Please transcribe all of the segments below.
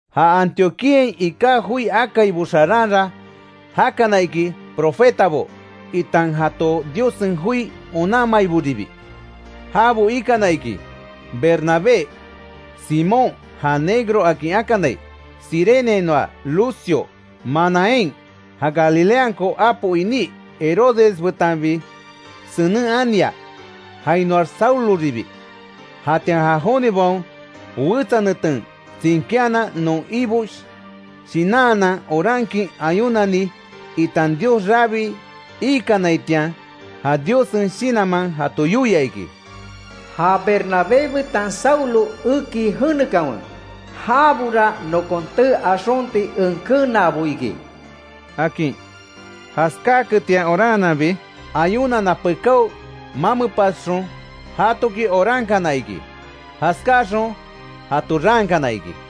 Ja Antioquíain iká joi akaibo xaranra jakana iki profetabo, itan jato Diossen joi onanmaiboribi. Jabo ikana iki, Bernabé, Simón (ja Negro akin akanai), Cireneainoa Lucio, Manahem (ja Galileanko apo iní Herodes betanbi senen ania), jainoax Sauloribi. Jatian ja jonibaon wetsa neten tsinkíanan non Ibo shinanhanan orankin ayunani itan Dios rabii ikanaitian, ja Diossen Shinanman jato yoia iki: “Ja Bernabé betan Saulo eki jenekanwe, jabora nokon tee axonti en kenaabo iki”, akin. Jaskáketian oranhananbi, ayunana pekáo mamepasxon jatoki orankana iki. Jaskáaxon jato raankana iki.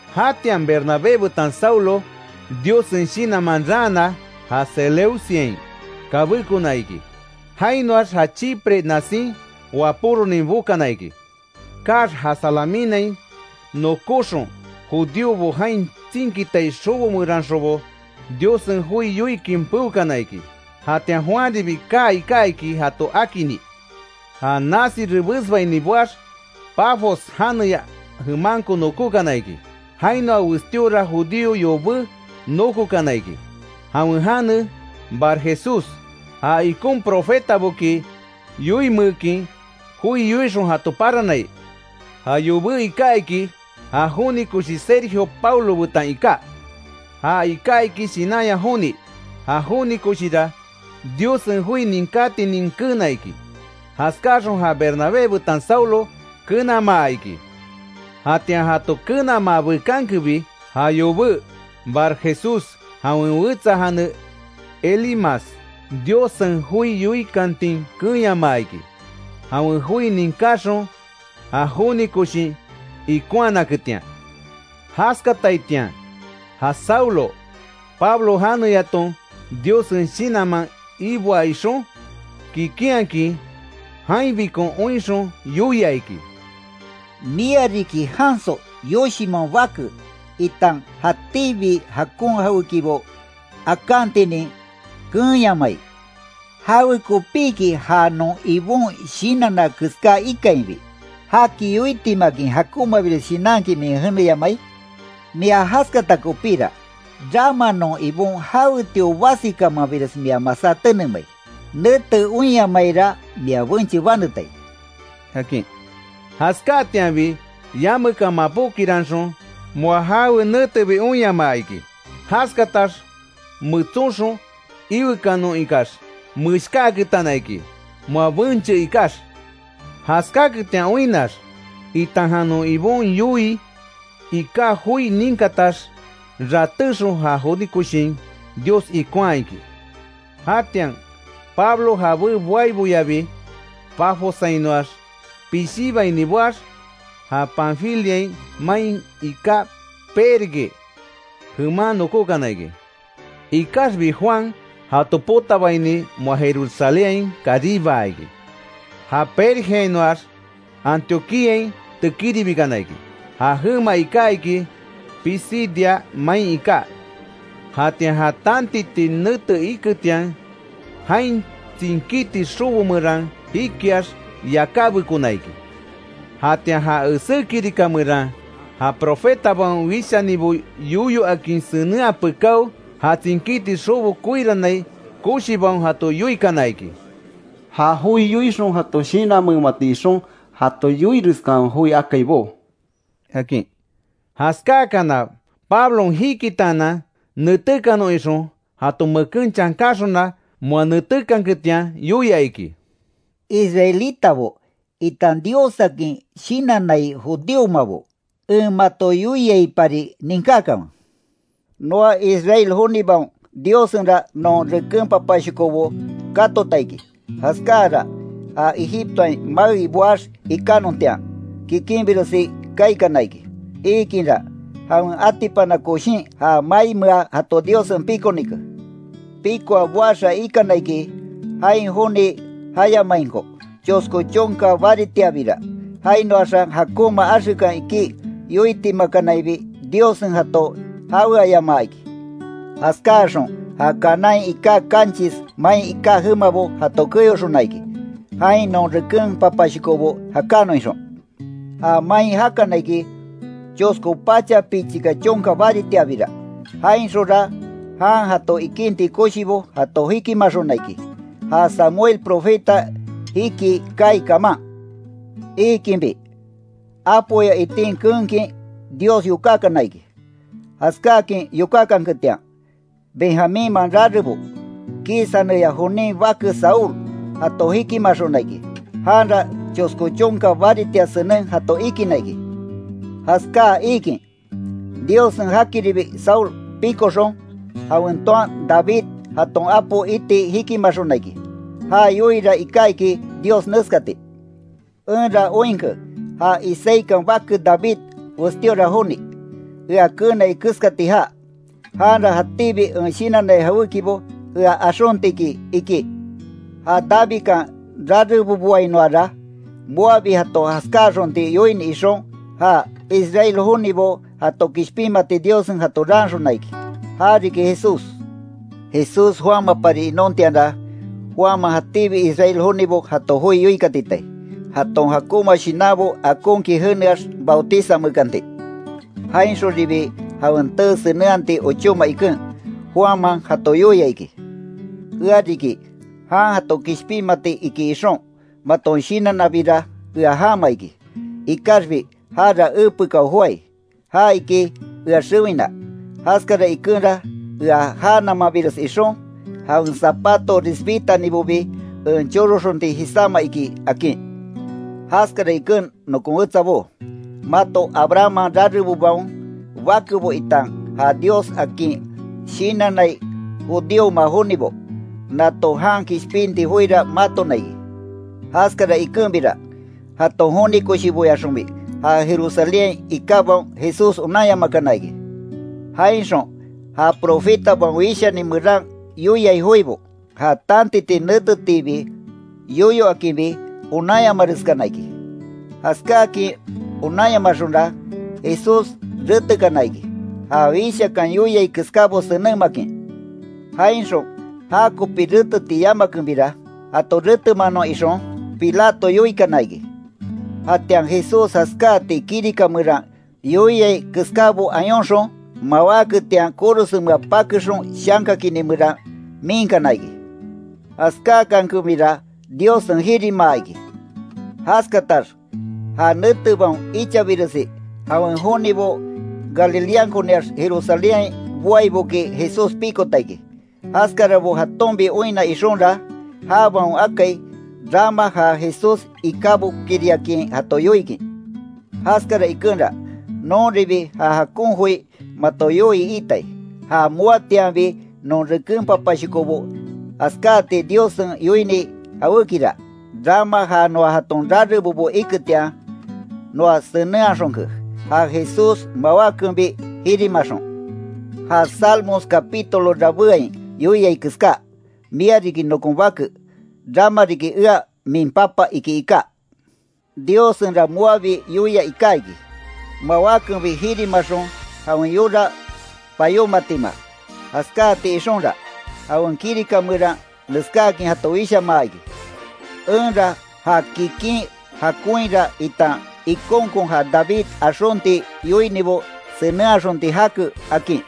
Jatian Bernabé betan Saulo Diossen Shinanman raana, ja Seleuciain kabékona iki. Jainoax ja Chipre nasin wapóronin bokana iki. Kaax ja Salaminain nokóxon, judíobo jain tsinkitai xobo meranxonbo Diossen joi yoikin peokana iki. Jatian Juanribi kaa iká, iki jato akini. Ja nasi rebesbaini boax, Pafos janeya jemanko nókokana iki. Jainoa westíora judío yobé nókokana iki; jawen jane Barjesús, ja ikon profetaboki yoinmeekin joi yoixon jato paranai. Ja yobé iká iki, ja joni koshi Sergio Paulo betan iká. Ja iká iki shinanya joni; ja joni koshira Diossen joi ninkátinin keena iki. Jaskáxon ja Bernabé betan Saulo kenamaa iki. Jatian jato kenamaa bekankebi, ja yobé Barjesús, jawen wetsa jane Elimas, Diossen joi yoikantin keenyamaa iki, jawen joi ninkáxon ja joni koshin ikonhanaketian. Jaskataitian, ja Saulo, Pablo janeyaton, Diossen Shinanman iboa ixon, kikinhakin jainbikon oinxon, yoia iki: —¡Mia riki janso, yoshinman bake, itan jatíbi jakon jawékibo akantinin keenyamai! ¿Jawekopiki ja non Ibon shinanna keská ikainbi, jaki yoitimakin jakonmabires shinankin min jeneyamai? Mia jaskata kopíra, rama non Ibon jawetio basikamanres mia masá tenemai, nete oinyamaira mia benche banetai —akin. Jaskáatianbi yamekan mapókiranxon, moa jawe netebi oinyamaa iki. Jaskatax metsonxon iwekanon ikax, meshkáaketana iki, moa benche ikax. Jaskáketian oinnax, itan non Ibo yoii iká joi ninkatax, ratéxon ja joni koshin Dios ikonhaa iki. Jatian Pablo jabé boaiboyabi Pafossainoax pishíbaini boax ja Panfilia main iká Perge jeman nokókana iki. Ikaxbi Juan jato potabaini moa, Jerusalénhain karibaa iki. Ja Pergeainoax, Antioquíain tekíribikana iki, ja jema iká iki Pisidia main iká. Jatian ja tantiti nete iketian, jain tsinkíti xobo meran jikiax, yakábekona iki. Jatian ja esé kirika meran ja profetabaon wishanibo yoyo akin senenhaa pekáo, ja tsinkíti xobo koirannai koshibaon jato yoikana iki: —Ja joi yoixon jato shinanmeemati ixon, jato yoireskanwe joi akaibó —akin. Jaskáakana Pablon jikitaanan, netékanon ixon jato meken chankanxona moa netékanketian yoia iki: —Israelitabo, itan Diossakin shinannai judíomabo, en mato yoiaipari ninkákanwe: Noa Israel jonibaon Diossenra non reken papashokobo katota iki; jaskáara ja Egiptoain maei boax ikánontian, kikinbiresi kaikana iki. Iikinra, jawen atipana koshin ja maimea jato Diossen pikonike. Pikoa boaxa ikana iki, jain joni jayamainko, chosko chonka baritiabira, jainoaxa jakonma axekan iki yoitimakanaibi Diossen jato jaweayamaa iki. Jaskáaxon ja Canaánhain iká kanchis main jemabo jato keyoxona iki, jain non reken papashokobo jakanon ixon. Ja main jakana iki, chosko pacha pichika chonka baritiabira. Jainxonra jan jato ikinti koshibo jato jikimaxona iki; ja Samuel profeta jikii kaai kaman. Iikinbi, apoya itin keenkin Dios yokákana iki. Jaskáakin yokákanketian, Benjamínman rarebo Quis janeya jonin bake Saúl jato jikimaxona iki. Janra chosko chonka baritia senen jato ikinna iki. Jaskáa iikin, Diossen jakiribi Saúl pikoxon, jawen toan David jaton apo iti jikimaxona iki. Ja yoiira iká iki Dios neskati: ‘Enra oinke ja Isaíkan bake David westíora joni, ea keenai keskati jaa. Janra jatíbi en shinannai jawékibo ea axonti iki’, iki. Ja Davidkan rareboboainoara, moabi jato jaskáaxonti yoini ixon, ja Israel jonibo jato kishpinmati Diossen jato raanxona iki, ja riki Jesús. Jesús joámapari inontianra, Juanman jatíbi Israel jonibo jato joi yoikatitai, jaton jakonma shinanbo akonkin jeneax bautizanmeekanti. Jainxonribi jawen tee senenhati ochóma iken, Juanman jato yoia iki: ‘Ea riki jan jato kishpinmati iki ixon, maton shinannabira ea jama iki. Ikaxbi jara epekao joái. Já iki ea xewina, jaskara ikenra ea já namanbires ixon, jawen zapato risbitanibobi en choroxonti jisáma iki’, akin. Jaskara iken nokon wetsabó: Mato Abrahamman rarebobaon bakebo itan ja Dios akin shinannai judíoma jonibo. Nato jan kishpinti joira matona iki. Jaskara ikenbira, jaton joni koshiboyaxonbi ja Jerusalénhain ikábaon Jesús onanyamakana iki; jainxon ja profetabaon wishani meran yoiai joibo, ja tantiti netetiibi yoyo akinbi, onanyamareskana iki. Jaskáakin onanyamaxonra. Jesús retekana iki, ja Wíshakan yoiai keskábo senenmakin. Jainxon jakopi reteti yamakenbira, jato retemanon ixon Pilato yoikana iki. Jatian Jesús jaskáati kirika meran yoiai keskábo ayonxon, mawáketian korosenmea pakexon shanka kini meran miinkana iki. Jaskáakankenbira Diossen jirimaa iki. Jaskatax ja netebaon ichabiresi jawen jonibo Galileankoniax Jerusalénhain boaiboki Jesús pikota iki. Jaskarabo jatonbi oinna ixonra, jabaon akai, rama ja Jesús ikábokiriakin jato yoikin. Jaskara ikenra, nonribi ja jakon joi mato yoii iitai; ja moatianbi non reken papashokobo jaskáati Diossen yoini jawékira, rama ja noa jaton rarebobo iketian, noa senenhaxonke, ja Jesús mawákenbi jirimaxon. Ja Salmos capítulo rabéain yoiai keská: ‘Mia riki nokon Bake, rama riki ea min Papa’, iki iká. Diossenra moabi yoia iká iki, mawákenbi jirimaxon jawen yora payómatima. Jaskáati ixonra, jawen kirika meran neskáakin jato wishamaa iki: ‘Enra ja kikin jakonhira itan ikonkon ja David axonti yoinibo senenhaxonti jake’, akin.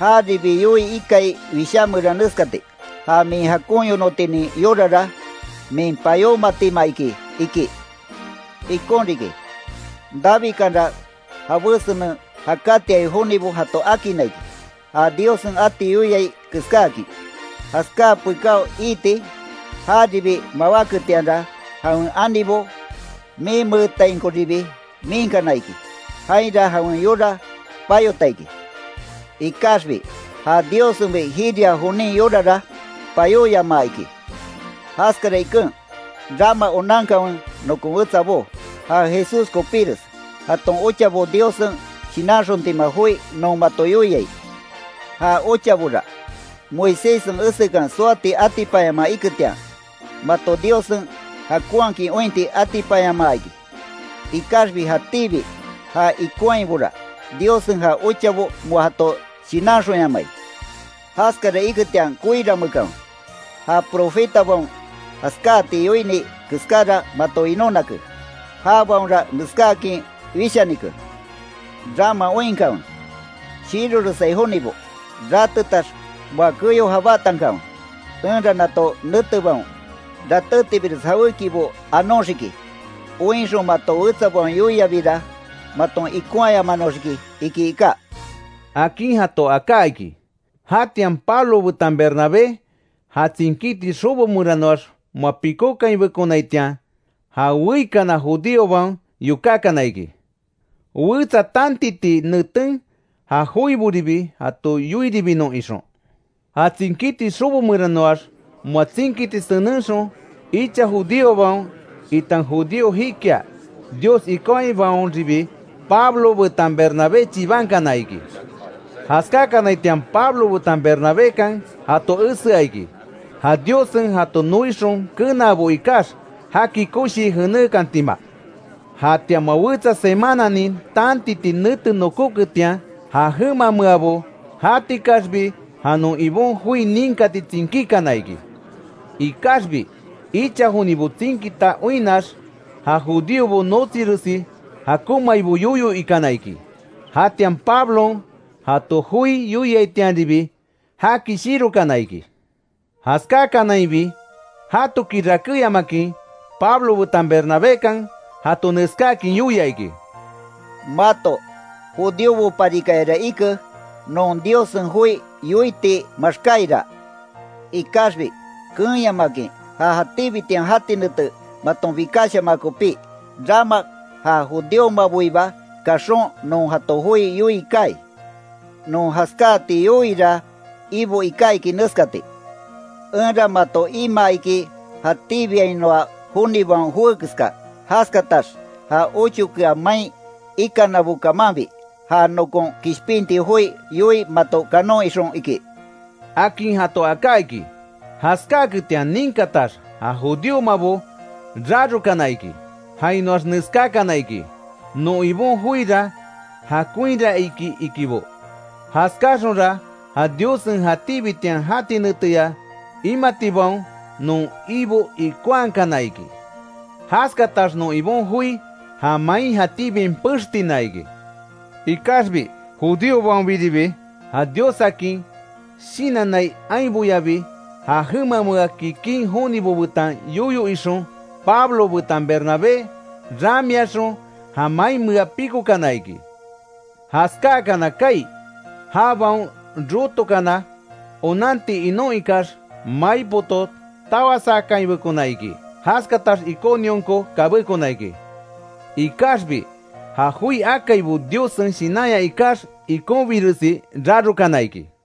Jaribi yoii ikai Wishá meran neskati: ‘Ja min jakon yonotinin yorara, min payómatima iki’, iki. Ikon riki, Davidkanra jabé senen jakatiai jonibo jato akinna iki, ja Diossen ati yoiai keskáakin. Jaskáa pekáo iiti, jaribi mawáketianra jawen anibo minmeetainkoribi miinkana iki, jainra jawen yora payota iki. Ikaxbi ja Diossenbi jiria jonin yorara, payóyamaa iki. Jaskara iken, rama onankanwe nokon wetsabó, ja Jesús kopires, jaton ochabo Diossen shinanxontima joi non mato yoiai. Ja ochabora, Moiséssen esekan soati atipanyamaa iketian, mato Diossen jakonhakin ointi atipanyamaa iki, ikaxbi jatíbi já ikonhaibora, Diossen ja ochabo moa jato shinanxonyamai. Jaskara iketian koiranmeekanwe, ja profetabaon jaskáti yoini keskára mato winonake. Jabaonra neskáakin wishanike: ‘Rama oinkanwe, shiroresai jonibo, rátetax moa keyo jabátankanwe, enra nato netebaon, ratétibires jawékibo anóxiki. Oinxon mato wetsabaon yoiabira maton ikonhayamanoxiki’, iki iká —akin jato aká iki. Jatian Pablo betan Bernabé, ja tsinkíti xobo meranoax moa pikókainbekonaitian, ja weikana judíobaon yokákana iki, wetsa tantiti neten ja joiboribi jato yoiribinon ixon. Ja tsinkíti xobo meranoax moa tsinkiti senenxon, icha judíobaon itan judío jikia Dios ikonhabaonribi, Pablo betan Bernabé chibankana iki. Jaskákanaitian Pablo betan Bernabékan jato esea iki, ja Diossen jato noixon kenaabo ikax, jaki koshii jenékantima. Jatian moa wetsa semananin tantiti nete nokóketian, ja jemameabo jatikaxbi ja non Ibon joi ninkati tsinkíkana iki. Ikaxbi icha jonibo tsinkita oinnax, ja judíobo notsiresi jakonmaibo yoyo ikana iki. Jatian Pablon jato joi yoiaitianribi, jaki shirokana iki. Jaskákanainbi jatoki rakéyamakin, Pablo betan Bernabékan jato neskáakin yoia iki: —Mato judíoboparikayara ike, non Diossen joi yoiti maxkáiraa; ikaxbi keenyamakin ja jatíbitian jati nete maton bikashamaa kopí, rama ja judíomaboiba kaxon non jato joi yoii kaai. Non jaskáati yoiira Ibo iká iki neskati: ‘Enra mato imaa iki jatíbiainoa joniboaon joé keska, jaskatax ja ochokea main ikanabo kamanbi, ja nokon kishpinti joi yoii mato kanon ixon’, iki —akin jato aká iki. Jaskáaketian ninkatax ja judíomabo rarokana iki. Jainoax neskákana iki: Non Ibon joira jakonhira iki ikibo, jaskáaxonra ja Diossen jatíbitian jati neteya imatibaon non Ibo ikonhaakana iki. Jaskatax non Ibon joi, ja main jatíbiain pextina iki. Ikaxbi judíobaonbiribi, ja Diossakin shinannai ainboyabi ja jemamea kikin jonibo betan yoyo ixon, Pablo betan Bernabé ramiaxon ja mainmea pikokana iki. Jaskáakana kaai, jabaon rotokana onanti inon ikax, mai poto tawasakainbekona iki. Jaskatax Iconionko kabékona iki. Ikaxbi ja joi akaibo Diossen Shinanya ikax, ikonbiresi rarokana iki.